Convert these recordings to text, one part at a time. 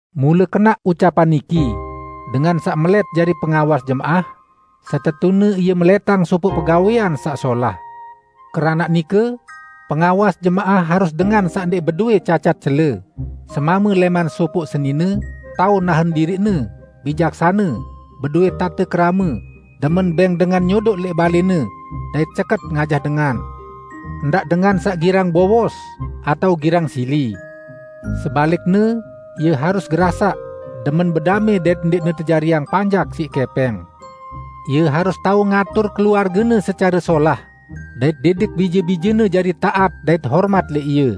Mule kenaq ucapan niki, "Dengan saq melẽt jari pengawas jemaah, setetune ie melẽtang sopoq pegawẽan saq solah." Keranaq nike pengawas jemaah harus dengan saq ndẽq bedowẽ cacat cele, semame lẽman sopoq senine, tao nahen diriqne, bijaksane, bedowẽ tate kerame; demen bẽng dengan nyodoq lẽq balẽne, dait ceket ngajah dengan; ndaq dengan saq girang bowos, atao girang sili. Sebalikne, ie harus gerasaq, demen bedamẽ dait ndẽqne tejariang panjak siq kẽpẽng. Ie harus tao ngatur keluargene secare solah, dait didik bije-bijene jari taat dait hormat lẽq ie.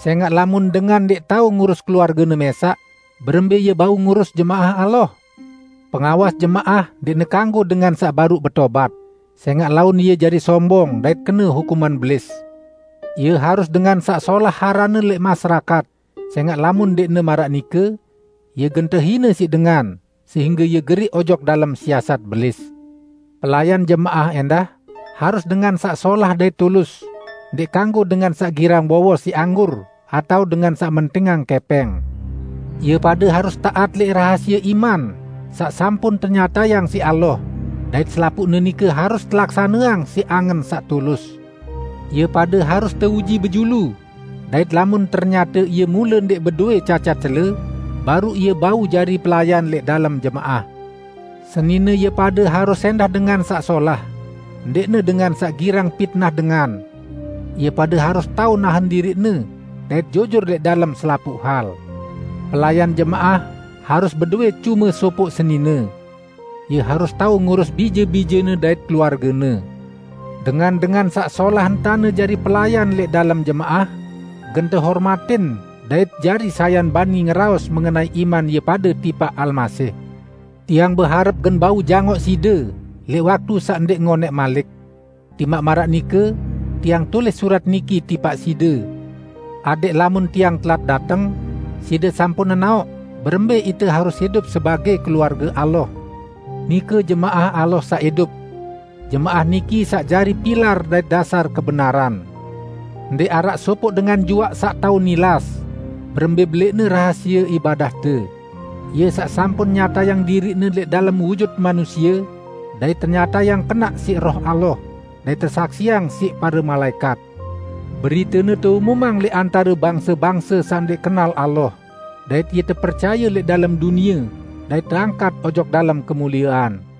Sẽngaq lamun dengan ndẽq tao ngurus keluargene mẽsaq, berembẽ ie bau ngurus jemaah Allah? Pengawas jemaah ndẽqne kanggo dengan saq baruq betobat, sẽngaq laun ie jari sombong dait kene hukuman Belis. Ie harus dengan saq solah aranne lẽq masyarakat; sẽngaq lamun ndẽqne maraq nike, ie gen tehine siq dengan, sehingge ie geriq ojok dalem siasat Belis. Pelayan jemaah ẽndah, harus dengan saq solah dait tulus; ndẽq kanggo dengan saq girang bowos siq anggur atao dengan saq mentingang kẽpẽng. Ie pade harus taat lẽq rahasie iman saq sampun tenyatayang siq Allah, dait selapuqne nike harus telaksaneang siq angen saq tulus. Ie pade harus teuji bejulu, dait lamun ternyate ie mule ndẽq bedowẽ cacat cele, baruq ie bau jari pelayan lẽq dalem jemaah. Senine ie pade harus ẽndah dengan saq solah, ndẽqne dengan saq girang pitnah dengan. Ie pade harus tao nahen diriqne dait jujur lẽq dalem selapuq hal. Pelayan jemaah harus bedowẽ cume sopoq senine. Ie harus tao ngurus bije-bijene dait keluargene. Dengan-dengan saq solah entane jari pelayan lẽq dalem jemaah, gen tehormatin dait jari sayan bani ngeraos mengenai iman ie pade tipaq Almasih. Tiang beharep gen bau jangoq side lẽq waktu saq ndẽq ngonẽq malik. Timaq maraq nike, tiang tulis surat niki tipaq side, adẽq lamun tiang telat dateng, side sampun nenaoq berembẽ ite harus idup sebagẽ keluarge Allah, nike jemaah Allah saq idup. Jemaah niki saq jari pilar dait dasar kebenaran. Ndẽq araq sopoq dengan juaq saq tao nilas, berembẽ belẽqne rahasie ibadahte: Ie saq sampun nyatayang diriq-Ne lẽq dalem wujut manusie, dait tenyatayang kenaq siq Roh Allah, dait tesaksiang siq pare malaẽkat. Beritene teumumang lẽq antare bangse-bangse saq ndẽq kenal Allah, dait Ie tepercaye lẽq dalem dunie dait teangkat ojok dalem kemuliean.